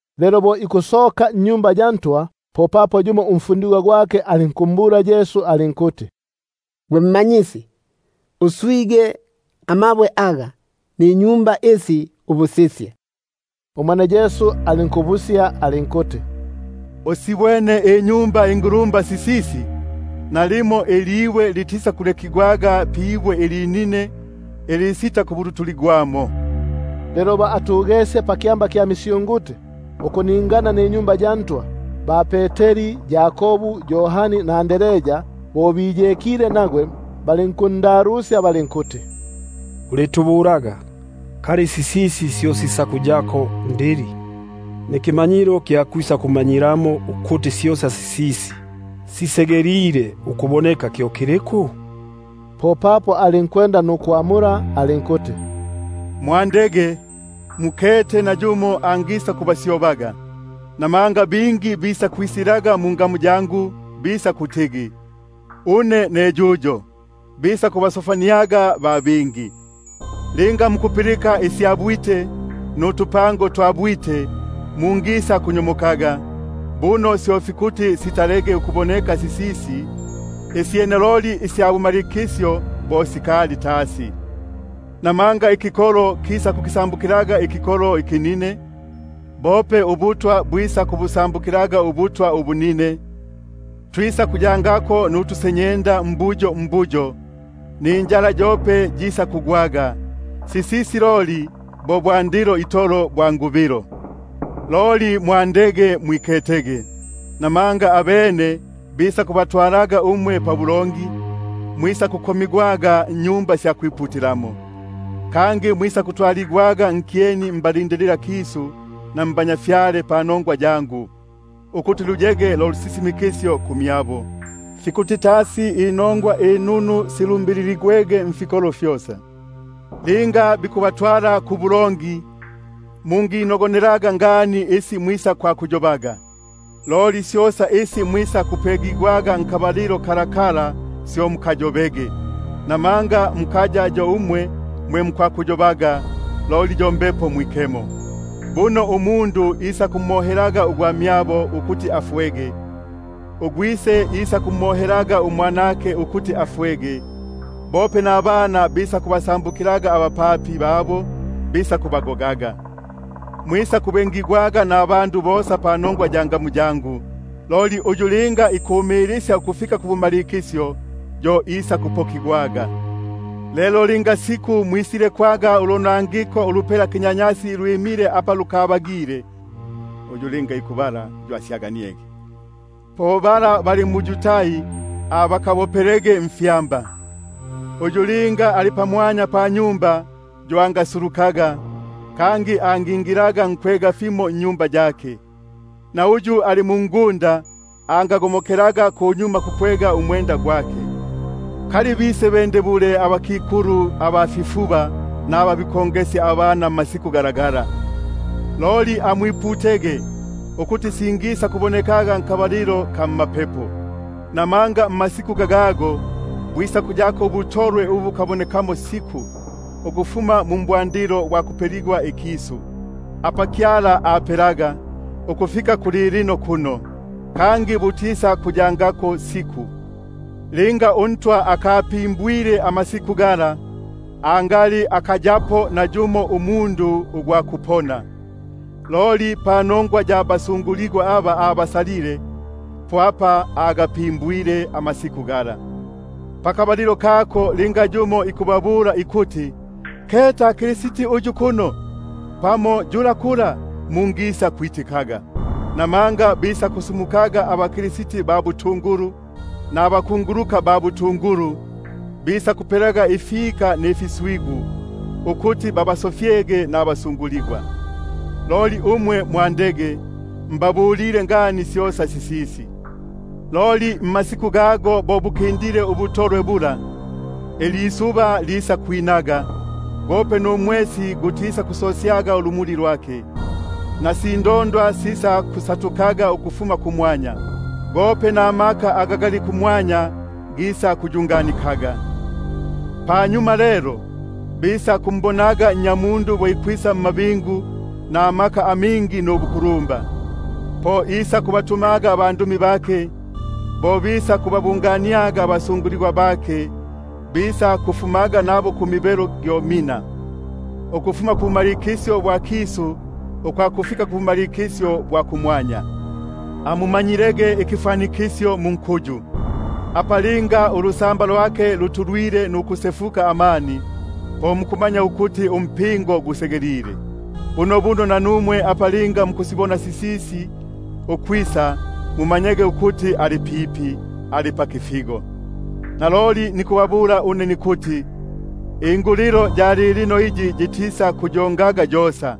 Lelo bo ikusoka mwa Tempeli, yumo mbafundigwa bake alinkumbula alinkuti: Mmanyisi, uswige amabwe aga ninyumba isi! Umwene Yesu alinkumbula alinkuti: Usibwene inyumba ingulumba isi? Litisakulekigwa ilibwe pamwanya pibwe ilinine ilisitakubulutuligwa. Lelo bo atugesye pakyamba kya misyunguti ukuningana na Tempeli, ba-Peteri, Yakobu, Yohani na Andrea, bo biyekile, balinkundalusya balinkuti: Ulitubulaga, kali sisisi syo sisakuyako ndili, nikimanyilo kya kwisakumanyilamo ukuti syosa sisisi sisegelile ukumalika kyo kiliku? Umwene Yesu alinkwanda ukubabula alinkuti: Mwandege, nayumo angisakubaso- fyaga. Bingi bisakwisilaga mungamu yangu, bisakutigi: Une ne yuyo, nukubasofya ba bingi. Linga mukupilika isya bwite nutupango twa bwite, mungisakunyomokaga; syo fikuti sisege sisisi, loli bukaya bo bumalikisyo. Namanga ikikolo kisakukisambukilaga ikikolo ikinine, bope ubutwa nubutwa ubunine; twisakuyako nutusenyenda mbuyo mbuyo, ninjala yope yisakugwaga; sisisi bo bwandilo bwa kukubilwa. Loli mwandege mwiketege. Buno bisakubabikaga pabulongi, mwisakukomigwaga mmaSinagogi, kangi mwisakutwaligwaga nkyeni mbalindililakisu na nabatwa panongwa yangu, ukuti luyege lo lusisimikisyo kumyabo. Fikuti tasi inongwa inunu silumbiligwege nifikolo fyosa. Linga bikubatwala nukubabika mbulongi, mungiyayilaga ngani isi mwisakwakuyobaga, loli syosa isi mwisakupegigwa nkabalilo kalakala syo mukayobege; namanga mukaya yo umwe mwe mukwakuyo- baga, loli yo Mbepo Mwikemo. Buno ugwamyabo isakumohelaga ugwamyabo ukuti afwege, ugwise isakumohelaga umwanake ukuti afwege, bope nabana bisakubasambukilaga abapapi nukubagoga. Mwisakubengigwaga nabandu bosa panongwa ya ngamu yangu; loli uyu linga ikumilisya ukufika kubumalikisyo, yo isakupokigwaga. Loli linga mwisilekwaga ulonangiko ulupela kinyanyasi lwimile apa lukabagile, — uyu linga ikubala yo asyaganiege —, po aba bali mu-Yudai bakabopelege mfyamba; uyu linga ali pamwanya panyumba yo angasulukaga, kangi angingilaga nkwega fimo nnyumba yake; na uyu ali mungunda angago- mokelaga kunyuma kukwega umwenda gwake. Hitata kuba- kikulu abafifuba naba bikongesya pisiku lilalila! Loli amwiputege ukuti singisakubonekaga mmapepo. Namanga mmasiku gago bwisakuyako ubutolwe bo ubu bukabonekamo siku, ukufuma mu mbwandilo bwa kupela, mumo Kyala ape-laga, ukufika kulilino kuno, kangi butisakuyangako siku. Linga uNtwa akagatumulaniaga amasiku gala, angali akayapo nayumo umundu ugwa kupona; loli panongwa ya basaligwa aba abasalile, agatumulenie amasiku gago. Pakabalilo kako linga yumo ikubabula ikuti: Keta Kristi uyu kuno, pamo yula kula, mungisakwitikaga. Buno bisakusumukaga bakristi ba butungulu, nabakunguluka ba butungulu, bisakupelaga ifika mfiswigu, ukuti linga sibagile babasofyege nabasaligwa. Loli umwe mwandege; mbabulile ngani syosa. Loli mmasiku gago bo bukindile ubutolwe bula, ilisuba lisakwinaga, numwesi gutisakusosyaga ulumuli lwake; syope nindondwa sisakusatukaga ukufuma kumwanya, gope namaka aga gali kumwanya gisakuyunganikaga. Panyuma lelo, bisakumbonaga Nnyamundu bo ikwisa mmabingu namaka amingi nubukulumba. Po isakubatumaga abandumi, nukubabungania abasaligwa bake ukufuma kumibelo gyo mina, ukufuma kubumalikisyo bwa kisu ukwakufika kubumalikisyo bwa kumwanya. Amumanyilege ikifwanikisyo munkuyu; apa linga ulusamba lwake lutulwile nukusefuka amani, po mukumanya ukuti umpingo gusegelile. Bunobuno nanumwe apa linga mukusibona sisisi ukwisa, mumanyege ukuti ali pipi, ali pakifigo. Naloli nikubabula une nikuti, ingulilo ya lilino iyi yitisaku- yongaga yosa,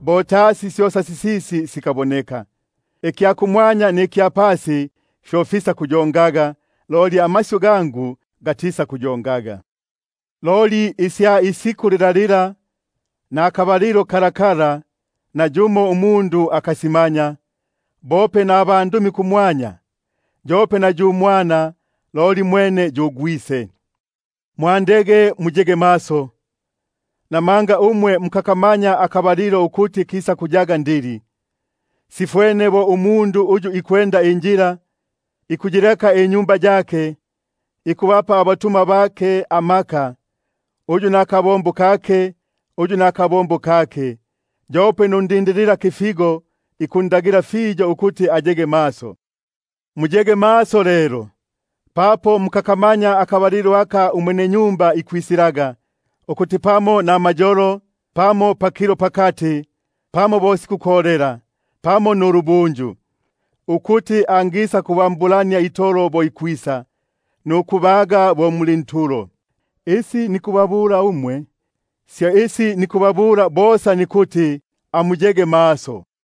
bo tasi syosa sisisi sikaboneka. Ikya kumwanya nikya pasi fyo fisakuyongaga, loli amasyu gangu gatisakuyongaga. Loli isya isiku lilalila, nakabalilo kalakala, nayumo umundu akasimanya, bope nabandumi ba kumwanya, yope na yu Mwana, loli mwene yu Gwise. Mwandege muye maso! Buno mukakamanya akabalilo ukuti kisakuyaga ndili. Sifwene bo umundu uyu ikwenda injila; ikuyileka inyumba yake, ikubapa abatumwa bake amaka, uyu nakabombo kake uyu nakabombo kake, nukundagila undindililakifigo ukuya maso. Muyege maso lelo; papo mukakamanya akabalilo aka umwenenyumba ikwisilaga, ukuti pamo namayolo, pamo pakilo pakati, pamo bo sikukolela, pamo nulubunju; ukuti angisa- kubambulania itolo bo ikwisa, nukubaga muli ntulo. Isi nikubabula umwe, syo nikubabula bosa: Amuyege maso.